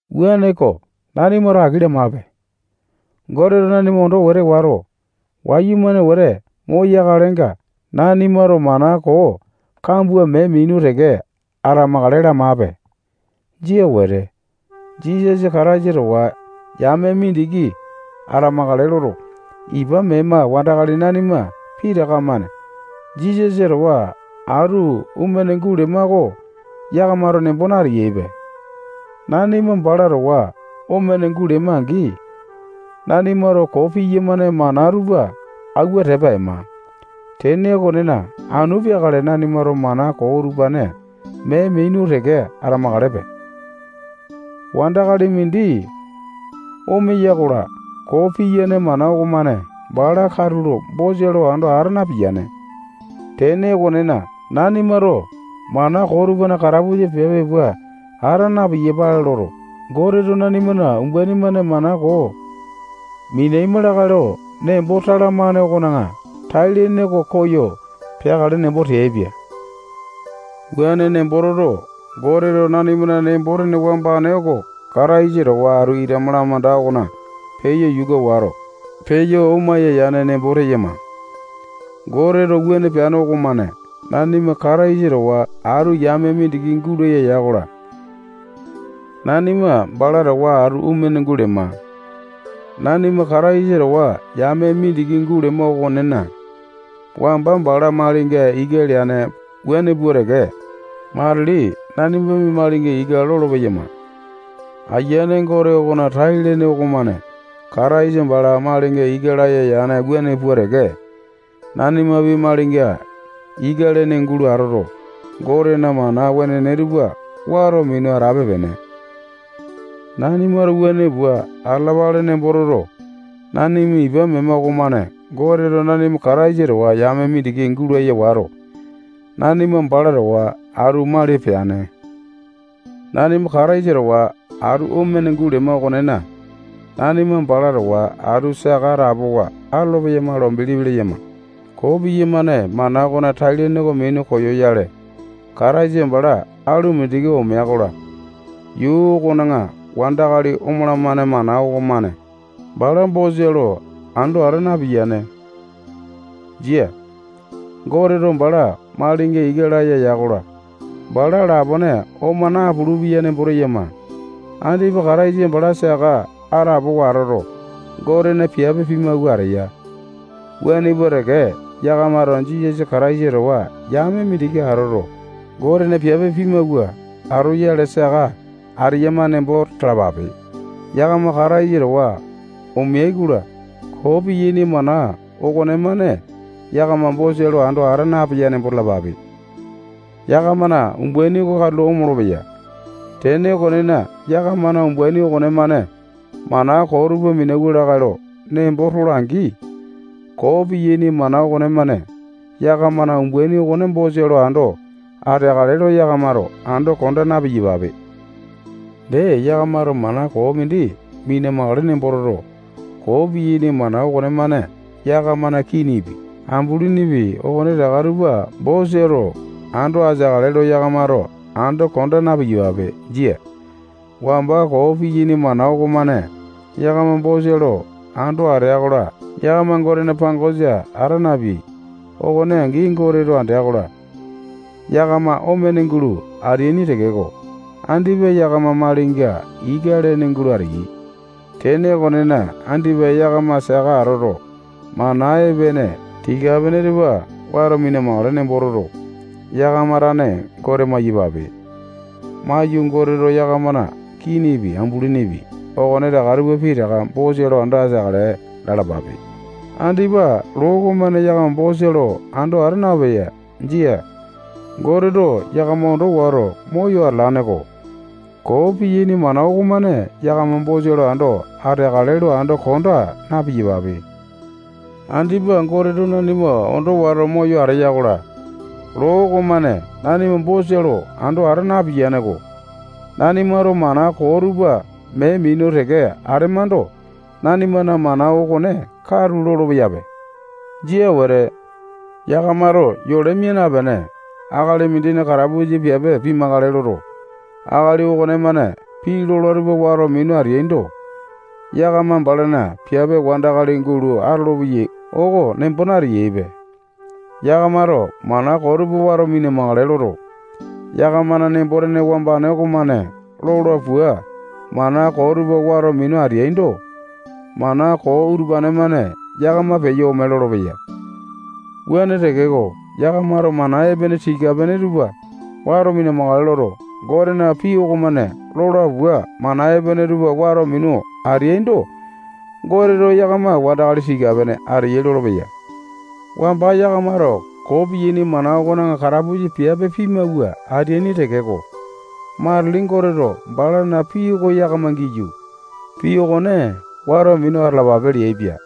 Wuaneko, nanimato aki lamape. Goteto nanima ondo wete wato, wayumane wete moyakalenga, nanimato mana koo kambua mee minu teke atamakale lamape. Jia wete. Jisasa Kataisa towa yame mindiki atamakale loto, ipa mema wandakali nanima pitaka-mane Jisasa towa atu omene gulema oko yakamato nembo nateyaipe. Nanima bala towa omene gulema-angi, nanimato koo piyamane mana tupa auwa tepa ema. Tene okonena, anu peakale nanimato mana koo utupane mee minu teke atamakalepe. Wandakali mindi omeya-kola, koo piyane mana okomane bala katulo bosa lo ando ata napiyane. Tene okonena, nanimato mana koo tupana katapusa piape pua ata na-piyapale loto, Goteto nanimana umbaini-mane mana koo minaima lakae lo nembo talamane okona tai-lene oko koyo peakale nembo teaipia. Wuane nembo toto, Goteto nanimana nembo-tene wambane oko Kataisa towa atu ita malamanda okona peyo yuka wato, peyo omaya yane nembo teyama. Goteto wuane peane okomane nanima Kataisa towa atu yame mindiki gulaya ya-kola, nanima bala towa atu omene gulema. Nanima Kataisa towa yame mindiki gulema okonena, wamba bala malinga ika leane wuane pua teke matili nanimapi malinga ika lolo-peyama-ko. Aiyane Gote okona tai-lene okomane Kataisa bala malinga ika laya yane wuane pua teke, nanimapi malinga ika lene gulo atoto, Gotena mana wenene tupa wato minu atape-pene. Nanimato wuane pua atalapale nembo toto, nanima ipa mema okomane Goteto nanima Kataisa towa yame mindiki gulaya wato, nanima bala towa atu mali peane. Nanima Kataisa towa atu omene gulema okonena, nanima bala towa atu saka atapowa atolo-peyama lo bilipi leyama. Koo piyamane mana okona tai-lene oko minu koyoyale, Kataisa bala alu mindiki omea-kola, yuu okona wandakali omalamane mana okomane bala bosa lo ando ata napiyane. Jia. Goteto bala malinga ika laya ya-kola, bala lapone oma napulu-peya nembo teyama. Andipa Kataisa bala saka atapowa atoto, Gotena piape pimawua ateya. Wuane pua teke, yakamato Jisasa Kataisa towa yame mindiki atoto, Gotena piape pimawua atoyale saka ateyama nembo talapape. Yakama Kataisa towa omeai-kola, koo piyaini mana okonemane yakama bosa lo ando ata napeya nembo talapape. Yakamana umbaini oko katulo omolo-peya. Tene okonena, yakamana umbaini okonemane mana koo tupa minauwa lakae lo nembo tola-angi, koo piyaini mana okonemane yakamana umbaini okone bosa lo ando ateakale lo yakamato ando konda na-piyapape. Dee, yakamato mana koo mindi mina-makale nembo toto, koo piyaini mana okonemane yakamana kinipi, ambulinipi, okonetaka tupa bosa lo ando ateakale lo yakamato ando konda na-piyapape. Jia. Wamba koo piyaini mana okomane yakama bosa lo ando atea-kola, yakama Gotena pangosa ata napeai. Okone angi, Goteto andea-kola, yakama omene gulo ateaini tekeko, andipa yakama malinga ika lene gulo ateyai. Tene okonena, andipa yakama saka atoto, mana epene tika-pene tupa wato mina-makale nembo toto, yakama tane Gote maiyapape. Maiyu, Goteto yakamana kinipi, ambulinipi, okonetaka tupa pitaka bosa lo ando ateakale lalapape. Andipa loo okomane yakama bosa lo ando ata napiyane. Jia. Goteto yakama ondo wato, moyo atalane-ko. Koo piyaini mana okomane yakama bosa lo ando ateakale lo ando konda na-piyapape. Andipa Goteto nanima ondo wato moyo ateya-kola, loo okomane nanima bosa lo ando ata napiyane-ko. Nanimato mana koo tupa mee minu teke atemando, nanimana mana okone katu lolopeyape. Jia wete. Yakamato yole mia napene, akali mindina katapusa piape pimakale loto, akali okonemane pii lola tupa wato minu ateaindo, yakama balana piape wandakali gulo atolopeyai oko nembo nateyaipe. Yakamato mana koo tupa wato mina-makale loto, yakamana nembo-tene wambane okomane lola pua mana koo tupa wato minu ateaindo, mana koo utupane-mane yakama peyo ome lolopeya. Wuane tekeko, yakamato mana epene tika-pene tupa wato mina-makale loto, Gotena pii okomane lola pua mana epene tupa wato minu ateaindo, Goteto yakama wandakali tika-pene ateyai lolopeya. Wamba yakamato koo piyaini mana okona katapusa piape pimawua ateaini tekeko, matili Goteto balana pii oko yakama giyu, pii okone wato minu atalapape leaipia.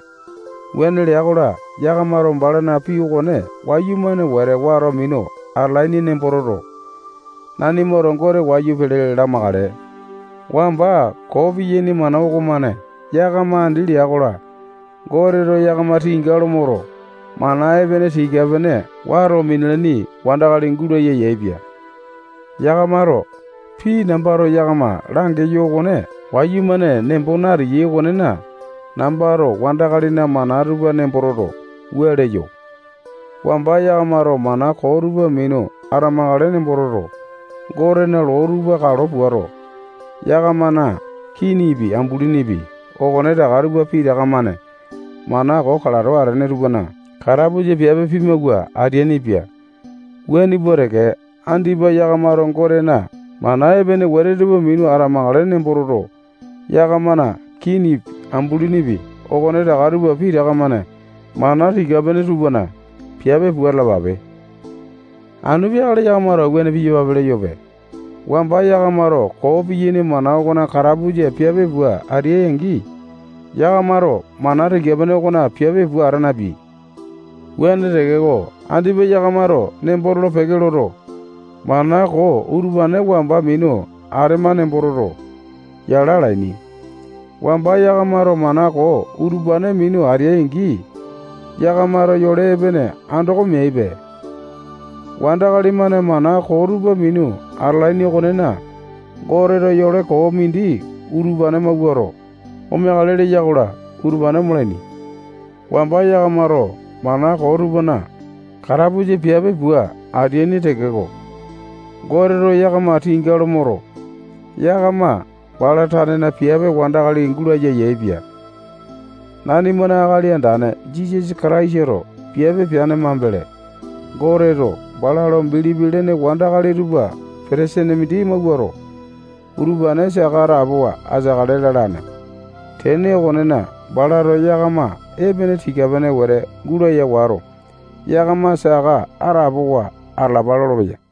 Wuane lea-kola, yakamato balana pii okone wayumane wete wato minu atalaini nembo toto, nanimato Gote wayu pele lamakale. Wamba koo piyaini mana okomane yakama andi lea-kola, Goteto yakama tinga lo moto, mana epene tika-pene wato minalaini wandakali gulaya yaepia. Yakamato pii nambato yakama langeyo okone wayumane nembo nateyai okonena, nambato wandakalina mana tupa nembo toto, wua leyo: Wamba yakamato mana koo tupa minu atamakale nembo toto, Gotena loo tupa kalo puato, yakamana kinipi, ambulinipi, okonetaka tupa pitaka-mane mana koo kalato atene tupana katapusa piape pimawua ateainipia. Wuane pua teke, andipa yakamato Gotena mana epene wete tupa minu atamakale nembo toto, yakamana kinipi, ambulinipi, okonetaka tupa pitaka-mane mana tika-pene tupana piape pua atalapape. Anu peakale nambato yakamato wuane piyapale leyope. Wamba yakamato koo piyaini mana okona katapusa piape pua ateai-angi, yakamato mana tika-pene okona piape pua ata napeai. Wuane tekeko, andipa yakamato nembo tolo-peke loto, mana koo utupane wamba minu atema nembo toto, yala alaini. Wamba yakamato mana koo utupane minu ateai-angi, yakamato yole epene andoko meaipe. Wandakali-mane mana koo tupa minu atalaini okonena, Goteto yole koo mindi utupane mawuato, omeakale leya-kola, utupane omalaini. Wamba yakamato mana koo tupana katapusa piape pua ateaini tekeko, Goteto yakama tinga lo moto, yakama bala tanena piape wandakali gulaya yaepia. Nanimana Akali Andane Jisasa Kataisato piape peane mambele, Goteto bala lo bilipi lene wandakali tupa petesene mindi mawuato, utupane saka atapowa ateakale lalane. Tene okonena, balato yakama epene tika-pene wete gulaya wato, yakama saka atapowa atalapa lolopeya.